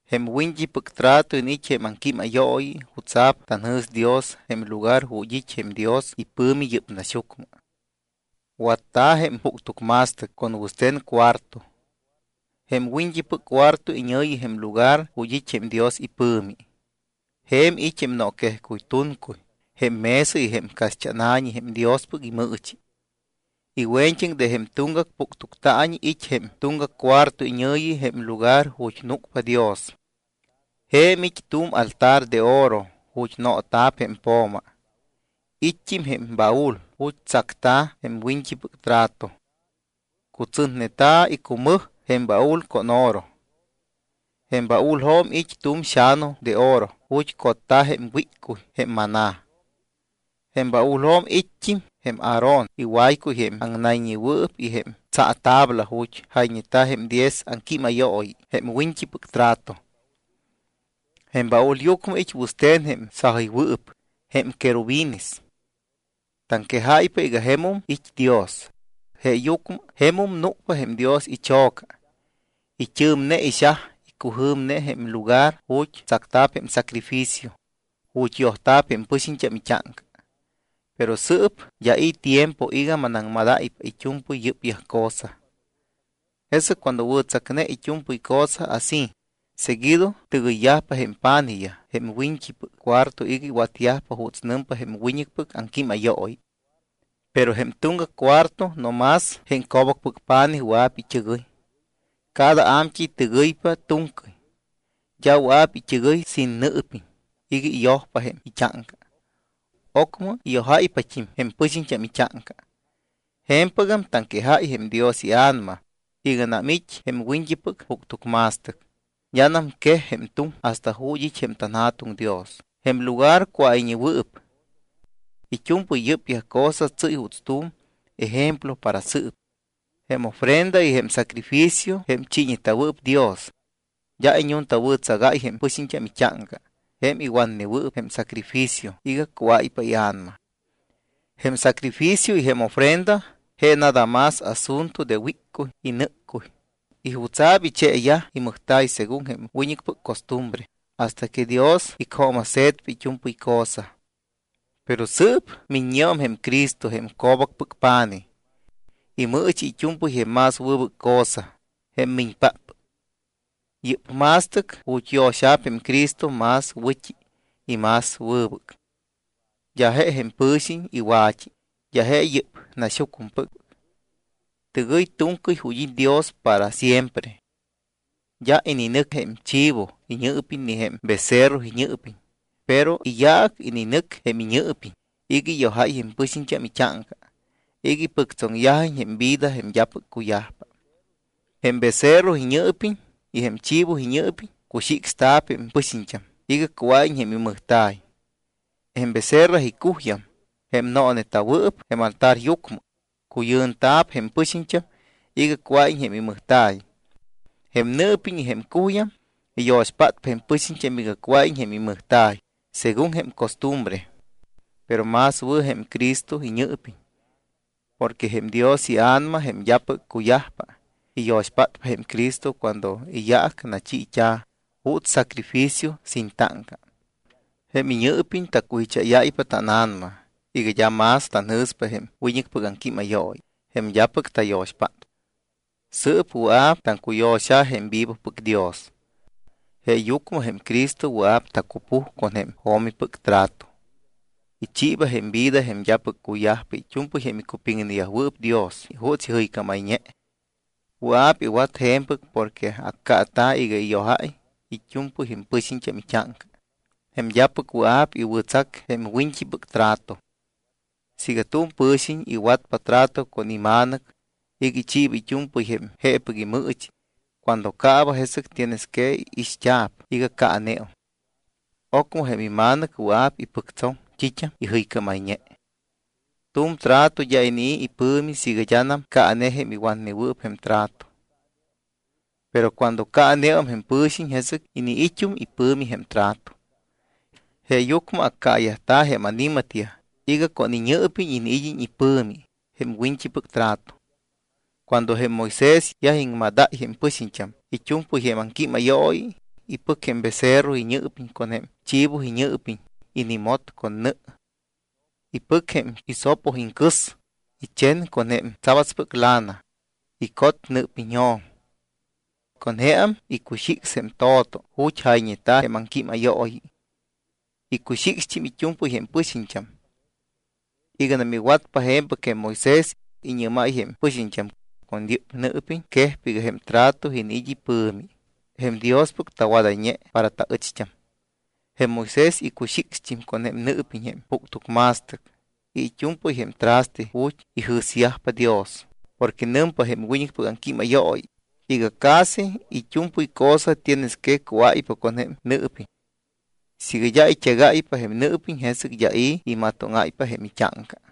Jém wiñt́ipɨc trato iniit́ jém aŋquímayooyi jutsa̱p tanjɨ̱s Dios jém lugar ju̱t́ it́ jém Dios ipɨ̱mi yɨ́p naxyucmɨ. Watta̱ jém puctucma̱stɨc con wɨste̱n cuarto. Jém wiñt́ipɨc cuarto iñɨ̱yi jém lugar ju̱t́ it́ jém Dios ipɨ̱mi. Je̱m it́ jém nooquejcuy tuncuy, jém mesa y jém caxt́ána̱ñi jém Diospɨc imɨɨchi. Iwe̱ñt́aŋ de jém tuŋgac puctuctaañi it́ jém tuŋgac cuarto iñɨ̱yi jém lugar ju̱t́ núcpa Dios. Je̱m it́ tu̱m altar de oro ju̱t́ noota̱p jém po̱ma. It́t́im jém baúl ju̱t́ tsacta̱ jém wiñt́ipɨc trato. Cutsɨtneta̱ icumɨj jém baúl con oro. Jém baúljo̱m it́ tu̱m xa̱nu de oro ju̱t́ cotta̱ jém wíccuy, jém maná. Jém baúljo̱m it́t́im jém Aarón iwaycuy jém aŋnayñewɨɨp y jém tsaatabla ju̱t́ jayñeta̱ jém diez aŋquímayooyi jém wiñt́ipɨc trato. Jém baúlyucmɨ it́ wɨste̱n jém sajɨywɨɨp, jém querubines. Taŋquejáypa iga jemum it́ Dios. Jemum núcpa jém Dios icho̱ca. It́ɨ̱mne ixaj, icujɨ̱mne jém lugar ju̱t́ tsacta̱p jém sacrificio ju̱t́ yojayt́a̱p jém pɨxiñt́am it́áŋca. Pero sɨɨp d́a i̱ tiempo iga maŋwɨ̱aŋmadáypa it́u̱mpɨy yɨ́pyaj cosa. Jesɨc cuando wɨ̱tsacne it́u̱mpɨy cosa así, seguido tɨgɨyyajpa jém pa̱nijyaj jém wiñt́ipɨc cuarto iga iwatyajpa juuts nɨmpa jém wiñɨcpɨc aŋquímayooyi. Pero jém tuŋgac cuarto, no más jém co̱bacpɨc pa̱nij wɨa̱p it́ɨgɨy. Cada a̱mt́ɨy tɨgɨypa tu̱ŋcɨy. D́a wɨa̱p it́ɨgɨy sin nɨɨpiñ iga iyojpa jém it́áŋca, ocmɨ iyojáypat́im jém pɨxiñt́am it́áŋca. Je̱mpɨgam taŋquejáy jém Dios iA̱nama, iganam it́ jém wiñt́ipɨc puctucma̱stɨc, d́anam quej jém tuŋ hasta ju̱t́ it́ jém tanJa̱tuŋ Dios, jém lugar cuáyñewɨɨp. It́u̱mpɨy yɨ́pyaj cosa tsɨ́y juuts tu̱m ejemplo para sɨɨp. Jém ofrenda y jém sacrificio jém chiiñeta̱wɨɨp Dios d́a iñuntawɨ̱tsagáy jém pɨxiñt́am it́áŋca jém iwatnewɨɨp jém sacrificio iga cuáypa ia̱nama. Jém sacrificio y jém ofrenda je nada más asunto de wíccuy y nɨ́ccuy y jutsa̱p icheeyaj imɨjta̱y según jém wiñɨcpɨc costumbre hasta que Dios icjooma̱se̱tpa it́u̱mpɨy cosa. Pero sɨɨp miññeum jém Cristo, jém co̱bacpɨc pa̱nij. Imɨɨchi it́u̱mpɨy jém más wɨbɨc cosa, jém miñpáppɨc. Yɨ́p ma̱stɨc ju̱t́ yo̱xa̱p jém Cristo más wɨ̱t́i y más wɨbɨc. D́a je jém pɨ̱xiñ iwa̱t́i, d́a je yɨ́p naxyucmɨpɨc. Tɨgɨy tu̱ŋcɨy ju̱t́ it́ Dios para siempre. D́a ininɨc jém chivo iñɨɨpiñ ni jém becerro iñɨɨpiñ, pero iyaac ininɨc jém iñɨɨpiñ iga iyojáy jém pɨxiñt́am it́áŋca iga ipɨctsoŋyajiñ jém vida jém d́apɨc cuyajpa. Jém becerro iñɨɨpiñ y jém chivo iñɨɨpiñ cuxicsta̱p jém pɨxiñt́am iga cuáyiñ jém imɨjta̱y. Jém becerra icuyjam, jém nooneta̱wɨɨp jém altaryucmɨ, cuyɨnta̱p jém pɨxiñt́am iga cuáyiñ jém imɨjta̱y. Jém nɨɨpiñ y jém cuyjam iyo̱xpátpa jém pɨxiñt́am iga cuáyiñ jém imɨjta̱y según jém costumbre. Pero más wɨ̱ jém Cristo iñɨɨpiñ. Porque jém Dios iA̱nama, jém d́apɨc cuyajpa, iyo̱xpát jém Cristo cuando iyaac nachiit́a̱ juuts sacrificio sin táŋca. Jém iñɨɨpiñ tacujicháyáypa tána̱nama iga d́a más tanjɨ̱spa jém wiñɨcpɨc aŋquímayooyi, jém d́apɨc tayo̱xpátpa. Sɨɨp wɨa̱p taŋcuyo̱xa̱ jém vivopɨc Dios. Jeeyucmɨ jém Cristo wɨa̱p tacupuj con jém jo̱mipɨc trato. Ichiiba jém vida jém d́apɨc cuyajpa it́u̱mpɨy jém icupiŋneyajwɨɨp Dios juuts ijɨycámayñe. Wɨa̱p iwat je̱mpɨc porque accaata̱ iga iyojáy it́u̱mpɨy jém pɨxiñt́am it́áŋca, jém d́apɨc wɨa̱p iwɨ̱tsac jém wiñt́ipɨc trato. Siiga tu̱m pɨ̱xiñ iwatpa trato con ima̱nɨc iga ichiiba it́u̱mpɨy jém jeepɨc imɨɨchi cuando caaba, jesɨc tienes que ixt́a̱p iga caaneum. Ocmɨ jém ima̱nɨc wɨa̱p ipɨctsoŋ t́it́am ijɨycámayñe. Tu̱m trato d́a inii̱ ipɨ̱mi siiga d́anam caane jém iwatnewɨɨp jém trato. Pero cuando caaneum jém pɨ̱xiñ, jesɨc iniit́um ipɨ̱mi jém trato. Jeeyucmɨ accaayajta̱ jém ani̱matyaj iga con iñɨɨpiñ iniid́iñ ipɨ̱mi jém wiñt́ipɨc trato. Cuando jém Moisés yaj iŋmadáy jém pɨxiñt́am it́u̱mpɨy jém aŋquímayooyi, ipɨc jém becerro iñɨɨpiñ con jém chivo iñɨɨpiñ, inimot con nɨ. Ipɨc jém hisopo iŋcɨs, ichen con jém tsabatspɨc lana, icot nɨɨpiñjo̱m, con jeam icuxics jém to̱to ju̱t́ jayñeta̱ jém aŋquímayooyi. Icuxicst́im it́u̱mpɨy jém pɨxiñt́am. Iganam iwatpa je̱mpɨc jém Moisés, iñɨ́máy jém pɨxiñt́am: “Con yɨ́p nɨɨpiñ quejpa iga jém trato iniit́ ipɨ̱mi jém Diospɨc tawadayñe para taɨcht́am.” Jém Moisés icuxicst́im con jém nɨɨpiñ jém puctucma̱stɨc y it́u̱mpɨy jém traste ju̱t́ ijɨ̱syajpa Dios. Porque nɨmpa jém wiñɨcpɨc aŋquímayooyi iga casi it́u̱mpɨy cosa tienes que cuáypa con jém nɨɨpiñ. Siiga d́a it́egáypa jém nɨɨpiñ, jesɨc d́a i̱ imatóŋáypa jém it́áŋca.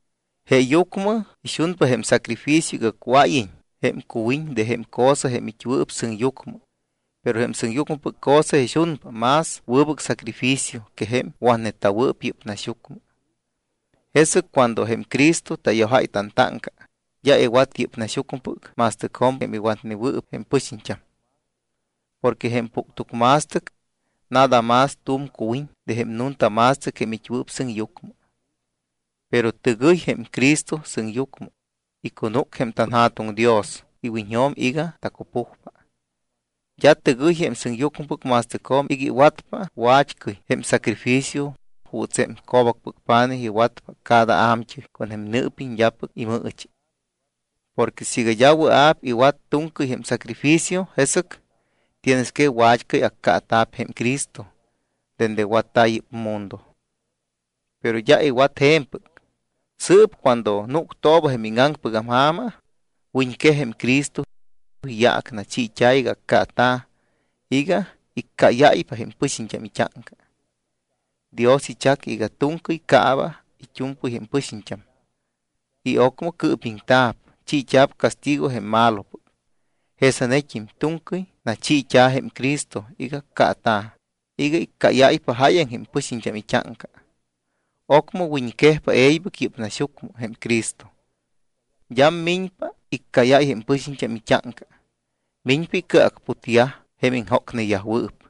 Jeeyucmɨ ixunpa jém sacrificio iga cuáyiñ jém cuwiñ de jém cosa jém it́wɨɨp sɨŋyucmɨ, pero jém sɨŋyucmɨpɨc cosa ixunpa más wɨbɨc sacrificio que jém watneta̱wɨɨp yɨ́p naxyucmɨ. Jesɨc cuando jém Cristo tayojáy tantáŋca, d́a iwat yɨ́p naxyucmɨpɨc ma̱stɨcjo̱m jém iwatnewɨɨp jém pɨxiñt́am. Porque jém puctucma̱stɨc nada más tu̱m cuwiñ de jém nunta ma̱stɨc jém it́wɨɨp sɨŋyucmɨ. Pero tɨgɨy jém Cristo sɨŋyucmɨ, icunúc jém tanJa̱tuŋ Dios iwiñjo̱m iga tacupujpa. D́a tɨgɨy jém sɨŋyucmɨpɨc ma̱stɨcjo̱m iga iwatpa wat́cɨy jém sacrificio juuts jém co̱bacpɨc pa̱nij iwatpa cada a̱mt́ɨy con jém nɨɨpiñ d́apɨc imɨɨchi. Porque siiga d́a wɨa̱p iwat tu̱ŋcɨy jém sacrificio, jesɨc tienes que wat́cɨy accaata̱p jém Cristo dende watta̱ yɨ́p mundo. Pero d́a iwat je̱mpɨc. Sɨɨp cuando núctooba jém íŋaŋpɨgam ja̱ma wiñquej jém Cristo. Iyaac nachiit́a̱ iga accaata̱ iga iccáyáypa jém pɨxiñt́am it́áŋca. Dios ichac iga tu̱ŋcɨy caaba it́u̱mpɨy jém pɨxiñt́am y ocmɨ cɨɨpiŋta̱p, chiit́a̱p castigo jém malopɨc. Jesanet́im tu̱ŋcɨy nachiit́a̱ jém Cristo iga accaata̱ iga iccáyáypa jáyaŋ jém pɨxiñt́am it́áŋca. Ocmɨ wiñquejpa e̱ybɨc yɨ́p naxyucmɨ jém Cristo. D́am miñpa iccáyáy jém pɨxiñt́am it́áŋca, miñpa icɨacputyaj jém iŋjócneyajwɨɨp.